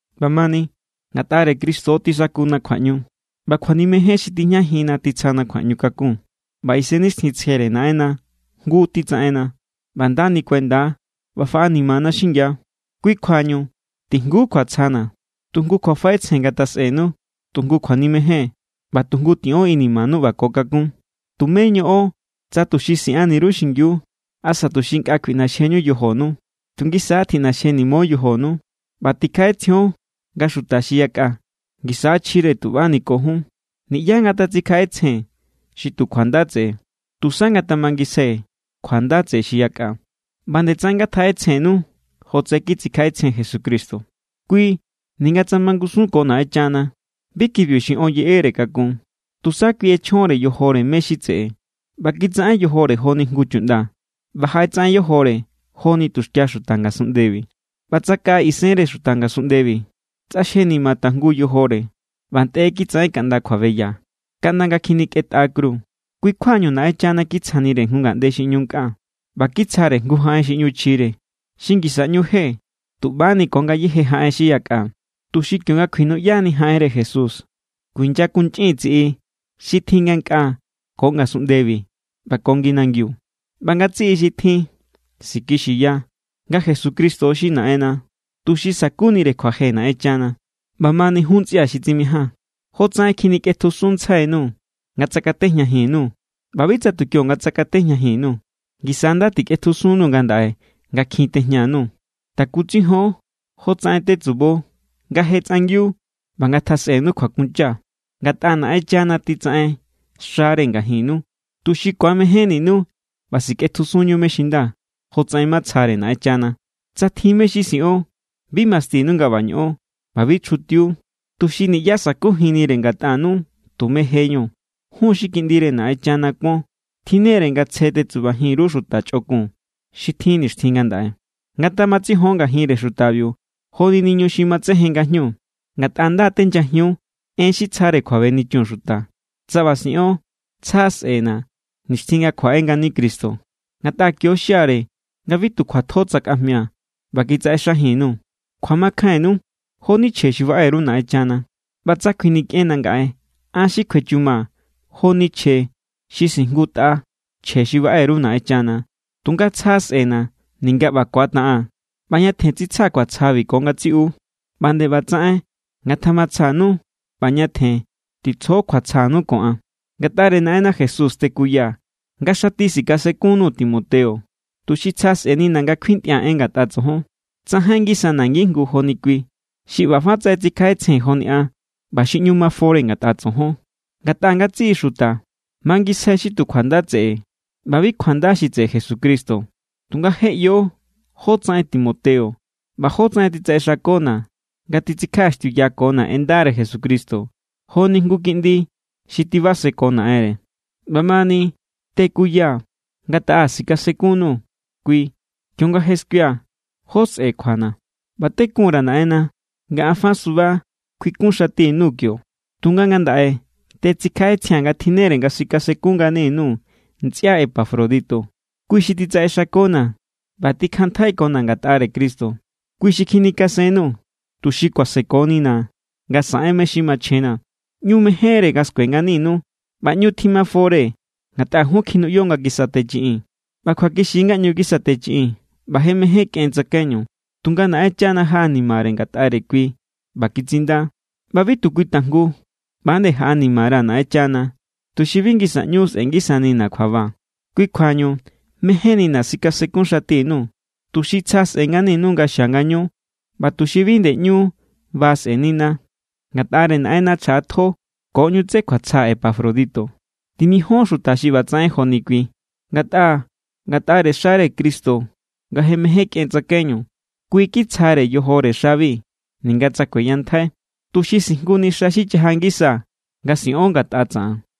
ꞌBamani, ngatꞌare Cristo tisakuna kjuaꞌñu, ꞌba kjuanimejen xi tijñajinna titsjana kjuaꞌñukakun, ꞌba Isennixtjintsjere Naꞌenna jngu titsaꞌenna, ꞌba nda nikuenda ꞌba faꞌanimana xingia. Kui= kjuañu tijngu kjuatsjana̱. Tu jngu kjuafaꞌetsjen ngatjasꞌenu, tu jngu kjuanimejen, ꞌba tu jngu tiꞌon inimanu ꞌba ko kakún. Tumé ñoꞌon tsa tuxi siꞌanni_ru xingiu asa tuxi nkꞌa kjuiꞌnoxjeñu yojonu. Tu ngisa= tjiꞌnoxjenimo yojonu ꞌba tikjaꞌetsjion nga xuta xi yakꞌa ngisa= chjire tuꞌbani ko jun. Niꞌyá ngatatsikjaꞌetsjen xi tu kjuanda tseꞌe. Tusa ngatamangisjai kjuanda tseꞌe xi yakꞌa. ꞌBa=nde tsaꞌen ngatjaꞌetsjennu jotsaꞌen kitsikjaꞌetsjen Jesucristo. Kui ninga tsa mangusun ko Naꞌenchana, bi kibiu xi on yeꞌere kakun. Tusa kui ꞌechjonre yojore mé= xi tseꞌe, ꞌba kitsaꞌen yojore joni jngu chuꞌnda, ꞌba jaꞌetsaꞌen yojore joni tuxkia xuta ngasunꞌndebi. ꞌBa tsakaꞌa isenre xuta ngasunꞌndebi, tsꞌaxjenima tajngu yojore, ꞌba ntꞌe kitsaꞌen kaꞌnda kjuabeya, kaꞌnda nga kjinikꞌentꞌa kru. Kui= kjuañu Naꞌenchana kitsjanire jngu ngaꞌnde xi ꞌñu nkꞌa, ꞌba kitsjare jngu jaꞌen xi ꞌnu chjire, xi ngisa ꞌñu je tuꞌbani ko ngayéje jaꞌen xi yakꞌa, tuxi kionga kuinuꞌyani jaꞌenre Jesús, kuinyakunchꞌin tsiꞌi xi tjin ngankꞌaa ko ngasunꞌndebi ꞌba ko ngi nangiu. ꞌBa ngatsiꞌi xi tjin sikixiya nga Jesucristo xi Naꞌenna, tuxi sa̱kunire kjuaje Naꞌenchana. ꞌBamani jun ntsꞌia̱ xi tsimijaa̱n, jotsaꞌen kjinikꞌetjusunntsjainuu̱ nga tsakatejñajin_nuu̱, ꞌba bi tsa tu kionga tsakatejñajin_nuu̱, ngisa= nda tikꞌetjusunnuu̱ ngandaꞌe nga kjin tejña_nuu̱. Takutsijon jo tsaꞌen tetsubo nga je tsꞌangiu ꞌba ngatjasꞌenu kjuakuncha. Ngatꞌa Naꞌenchana titsaꞌen xare ngajinnu, tuxi ku̱amejénninu ꞌba sikꞌetjusunñu mé= xi nda, jotsaꞌen matsjare Naꞌenchana. Tsa tjin mé= xi siꞌon, bi mastinu nga ꞌba ñoꞌon ꞌba bi chjutiu, tuxi niꞌyá sa̱kujinnire ngatꞌanu tume jeñu. Jun xi kiꞌndire Naꞌenchana kuon tjinnere nga tsje tetsubajin_ru xuta chꞌokun xi tjin nixtjin ngandaꞌe. Ngatamatsijon ngajinre xutabiu joni niñu xi matsejen ngajñu, ngatꞌa nda tenyajiun en xi tsjare kjuabenichun xuta. Tsa ꞌba siꞌon, tsja sꞌe̱na̱ nixtjin nga kjuaꞌe ngani Cristo. Ngatꞌa kio xiare nga bi tu kjuatjo tsakajmia̱ ꞌba kitsaꞌexajin_nuu̱. Kjuamakjainnu jo=ni chje xi baꞌe_ru Naꞌenchana. ꞌBa tsa kjuinikꞌenna̱ ngaꞌe, an xi kjuechumaa̱ joni chje xi sijngutꞌa chje xi baꞌe_ru Naꞌenchana. Tunga tsja sꞌe̱na̱ ninga ꞌba kuataꞌaa̱n, ꞌba ñatjen tsitsjaa̱ kjuatsjabi ko ngatsiꞌu. ꞌBa nde ꞌbatsaꞌen ngatamatsjanu, ꞌba ñatjen titsjo kjuatsjanu ko an. Ngatꞌare Naꞌenna Jesús tekuyaa̱ nga xati sikasenkun_nuu̱ Timoteo, tuxi tsja sꞌe̱nina̱ nga kuintꞌia̱ en ngatꞌa tsojon. Tsajain ngisana̱ ngijngu joni kui, xi ꞌba fa tsaꞌen tsikjaꞌetsjen joni an ꞌba xi ꞌñu mafore ngatꞌa tsojon. Ngatꞌa ngatsiꞌi xuta mangisjai xi tu kjuanda tseꞌe ꞌba bi kjuanda xi tseꞌe Jesucristo. Tunga je ꞌyo jótsaꞌen Timoteo, ꞌba jótsaꞌen titsaꞌexakona̱ nga titsikjaꞌaxtiuyakona̱ en ndare Jesucristo, joni jngu kiꞌndi xi tibaseko naꞌenre. ꞌBamani tekuyaa̱ nga taꞌa sikasenkun_nuu̱ kui kionga je skuia̱ jó sꞌe̱ kjuana̱. ꞌBa tekunra̱ Naꞌenna nga an fa suba kjuikunxati_nuu̱ kio. Tunga ngandaꞌe tetsikjaꞌetsjia̱n nga tjinnere nga sikasenkun ngani_nuu̱ ntsꞌia Epafrodito. Kui xi titsaꞌexakona̱ ꞌba tikjanntjaikona̱ ngatꞌare Cristo. Kui xi kjinikasennuu̱, tuxi kuasekonina̱ nga saꞌen mé= xi machjenna̱. ꞌÑu mejénre nga skue nganinu ꞌba ñu timafore ngatꞌa jun kjinuꞌyo nga kisatechiꞌin. ꞌBa kjuakixi= nga ꞌñu kisatechiꞌin ꞌba je mején kꞌen tsakaiñu. Tunga Naꞌenchana jaꞌanimare ngatꞌare kui ꞌba kitsinda. ꞌBa bi tu kui tajngu, ꞌba=nde an jaꞌanimara̱ Naꞌenchana, tuxi bi ꞌñu sꞌe̱ngisanina̱ kjuaba. Kui= kjuañu mejénnina̱ sikasenkunxatini_nuu̱, tuxi tsja sꞌe̱ nganinu nga xia ngañu ꞌba tuxi bi nde ꞌñu ba sꞌe̱nina̱. Ngatꞌare Naꞌenna chjaꞌatjo ko ꞌñu tsé kjuatsja Epafrodito. Timijón xuta xi ꞌbatsaꞌen joni kui. Ngatꞌa ngatꞌare xare Cristo nga je mején kꞌen tsakaiñu. Kui kitsjare yojore xabi ninga tsa kueyantjai, tuxi sijnguni xa xi chaja ngisa nga siꞌon ngatꞌa tsaꞌan.